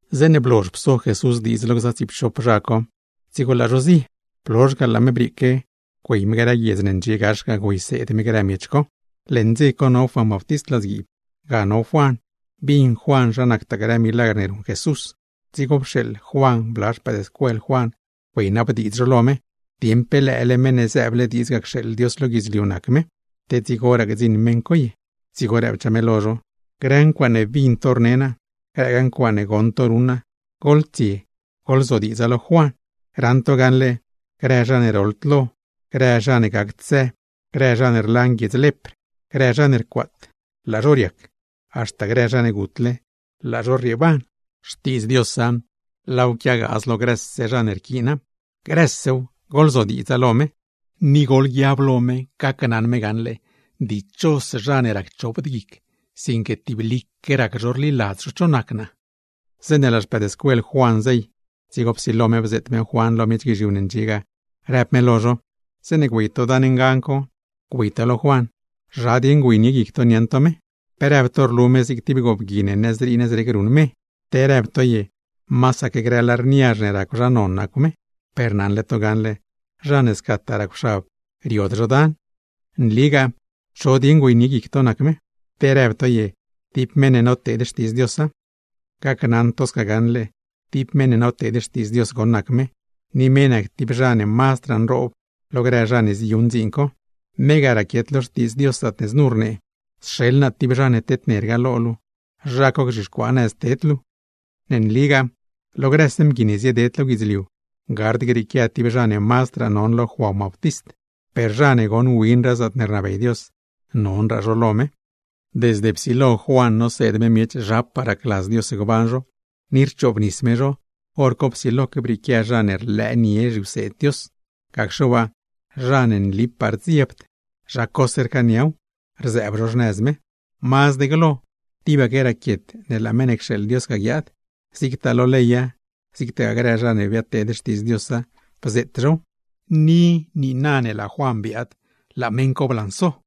Zeeṉe blozh pso Jesús diidz lo gza tsiipchop zha co, dzigo laa zho zie. Blozh ga laa me brieeque, güey me grë guiedz ne ndxie gax ga, güeyseed me grë miech co. Leṉ dze co no Juan Bautist ladzguiib, ga no Juan bin Juan zha nactaa grë milagr ne ruṉ Jesús, dzigo pxeeḻ Juan bla xpëëdscuel Juan güeynabdiidz zho lo me, dieṉ pe lëële Meṉ ne zëëble diidz cxeeḻ Dios lo guidzliu ga nac me, te dzigoraa gdziṉ meṉ co ye. Dzigo rëbchaa me lo zho: ―Grë ncuaaṉe bin to rne naa, grëgaa ncuaaṉe goṉ to ruṉ naa, goḻtsie goḻzodiidza lo Juan. Raṉ to gaṉle grë zha ne roḻd lo, grë zha ne gacd së, grë zha ne rlan guiedz lepr, grë zha ne rcuaat, laa zho riac; haxta grë zha ne gutle, laa zho rrieeban. Xtiidz Diosa, laaw quiagaaz lo grëse zha ne rquiina. Grësew, goḻzodiidza. Ni goḻguiab lo me, dichos zha ne racchopd guic, sinque tiblique rac zho rliladz zho cho nac naa. Zeeṉe laa xpëëdscuel Juan zey, dzigo psilo me bzeet me Juan lo miech guizhiu ne ndxie lo me ga, rëb me: ―Zeeṉe güey to dan ngan co, güey to lo Juan, ¿zha dieṉ güeynie guic to niaṉ to me? ¿Pe rëb to rlu me zig tib goobgui ne nëzrii nëzrec rey me, te rëb to ye masaque grë lar niazh ne racw zha non nacw me? Per naṉle to gaṉle zha ne scataa racwxab riod zho dan. Nligaa cho dieṉ güeynie guic to nac me, ¿te rëb to ye tib meṉ ne noteed xtiidz Diosa? Gacnaṉ to gaṉle tib meṉ ne noteed xtiidz Dios goṉ nac me, ni me nac tib zha ne mazdraa nroob lo grë zha ne ziyuṉ dziin co. Me ga raquiet lo Xtiidz Dios zaatne znu rnee: Sxeḻ naa tib zha ne tednerga lo luu, zha co gzhixcuaa nëz ne ted luu. Ne nligaa lo grëse mgui ne zieded lo guidzliu gard grieequia tib zha ne mazdraa non lo Juan Bautist; per zha ne goṉ winraa zaatne rnabey Dios, nonraa zha co lo me. ’Desde psilo Juan noseed me miech zhapaa racladz Dios gban zho, ni rchoobnis me zho, hor co psiloque brieequia zha ne rlëënie zhiwseed Dios, gacxe waa zha ne nlipaa rdziebd, zha cose rcaaniaw, rzëëb zho xnëz me. Mazd glo tibaque raquiet ne laa meṉ ne cxeeḻ Dios ga guiaad, zigtaa lo leya, zigtagaa grë zha ne biadteed xtiidz Diosa, bzeet zhow. Ni niina ne laa Juan biaad, laa meṉ co blanso.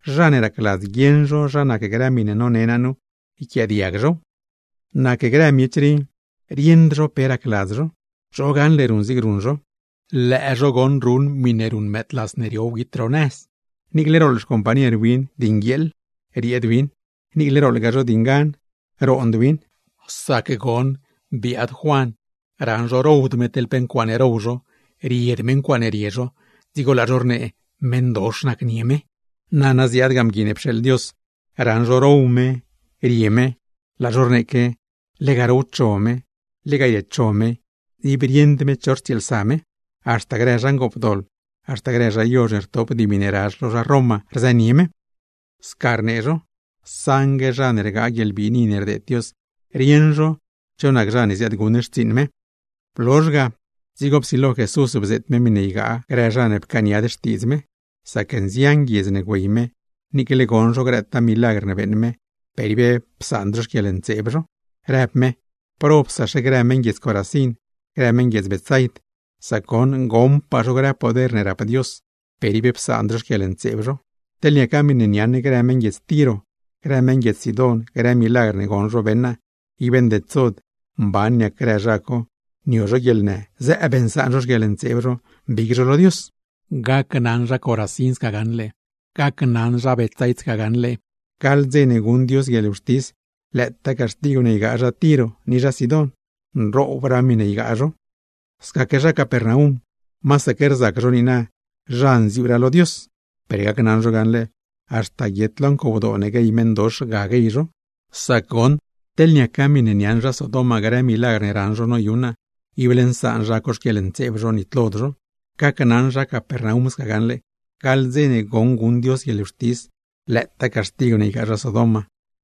Zha ne racladz guieṉ zho zha nac grë miṉe none naa nu, ¡yquiaadiag zhow! ’Nac grë miech rii, rieṉd zho pe racladz zho. ¿Cho gaṉle ruṉ zig ruṉ zho? Lëë zho ruṉ miṉe ruṉ mëëdlas ne rio wguit ro nëz, niicle rooḻ xcompañer win di nguieeḻ rieed win, niicle rooḻgaa zho di ngan, roond win. Sac goṉ biaad Juan, raṉ zho rowd me teḻ pe ncuaaṉe row zho, ried me ncuaaṉe rie zho, dzigo laa zho rnee meṉdox nacnie me. Blozh ga ziaad Mgui ne pxeeḻ Dios, raṉ zho row me, rie me, laa zho rneeque, lega rowcho me, lega riecho me, ib rieṉd me cho rtsieelsa me, haxta grë zha ngoopdoḻ, haxta grë zha yozh ne rtop dimi ne razh lo zha Roma rzënie me. Sca rnee zho, saṉgue zha ne rgaa guieḻbiini ne rdeed Dios, rieṉ zho cho nac zha ne ziaadguṉ xtsiiṉ me. Blozhse ga, dzigo psilo Jesús bzeet me miṉe ygaa grë zha ne pcaaniad xtiidz me; sac nzian guiedz ne güey me niicle goṉ zho grëtaa milagr ne beeṉ me, per ib psaand zho xquieḻntseeb zho, rëb me: ―¡Probsaxe grë meṉ guiedz Corazín, grë meṉ guiedz Betsaid! Sac goṉ goṉpaa zho grë poder ne rap Dios, per ib psaand zho xquieḻntseeb zho. Teḻ niaca miṉe niaṉ grë meṉ guiedz Tiro, grë meṉ guiedz Sidón, grë milagr ne goṉ zho beṉ naa, ib ndedsod mban niac grë zha co nio zho guieḻnë, zëëb nsaan zho xquieḻntseeb zho, mbig zho lo Dios. Gacnaṉ zha Corazín, gacnaṉ zha Betsaid sca gaṉle, gaḻ dze ne guṉ Dios guieḻwxtis, lëëtaa caxtigw ne ygaa zha Tiro ni zha Sidón, mazdraa miṉe ygaa zho. Scaque zha Capernaum, masaque rzac zho niina zha nziuuraa lo Dios, per gacnaṉ zho gaṉle haxta guiet lo ncowdoo ne guey meṉdox ga guey zho; sac goṉ teḻ niaca miṉe niaṉ zha Sodom grë milagr ne raṉ zho noyuṉ naa, ible nsaan zha co xquieḻntseeb zho, nitlod zho. ¡Gacnaṉ zha Capernaum gaṉle gaḻ dze ne guṉ Dios guieḻwxtis, lëëtaa caxtigw ne ygaa zha Sodom,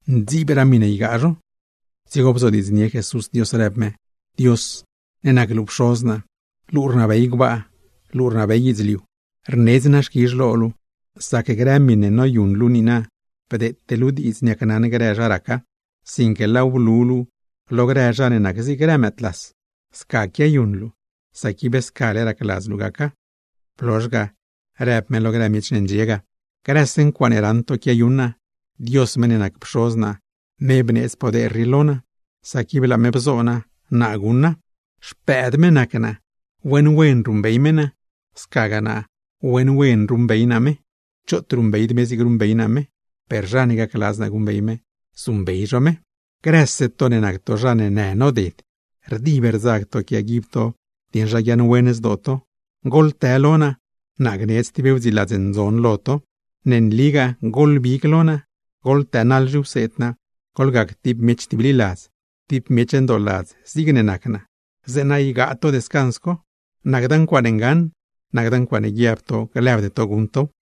mazdraa miṉe ygaa zho! Dzigo bzodiidznie Jesús Dios, rëb me: ―Dios luu ne nac luu Pxoz naa, luu rnabey gbaa luu rnabey guidzliu, rnedz naa xquizh lo luu sac grë miṉe noyuṉ luu nu niina bdeete luu diidz niacnaṉ grë zha raca, sinque laaw blu luu lo grë zha ne nac zig grë mëëdlas. Sca quiayuṉ luu, sac ib scale racladz luu gaca. Blozh ga rëb me lo grë miech ne ndxie ga: ―Grëse ncuaaṉe raṉ to quiayuṉ naa, Dios meṉ ne nac Pxoz naa, me bneedz poder rii lo naa; sac ib laa me bzo naa, naa guṉa. Xpëëd me nac naa, wen wen ruṉbey me naa, scagaa naa wen wen ruṉbey naa me. Choot ruṉbeyd me zigne ruṉbey naa me, per zha ne gacladz naa guṉbey me, zuṉbey zho me. ’Grëse to ne nac to zha ne në noded, rdib rdzag to quiaguib to dieṉ zha guiaaṉwen zdoo to, goḻtë lo naa, naa gneedz tib wdziiladz ndzon lo to. Nligaa goḻbig lo naa, goḻtënaḻ zhiwseed naa, goḻgac tib miech tibliladz, tib miech ndooladz zigne nac naa; zeeṉa gap to descans co. Nacda ncuaaṉe ngaṉ, nacda ncuaaṉe guiab to glëbde to guṉ tow.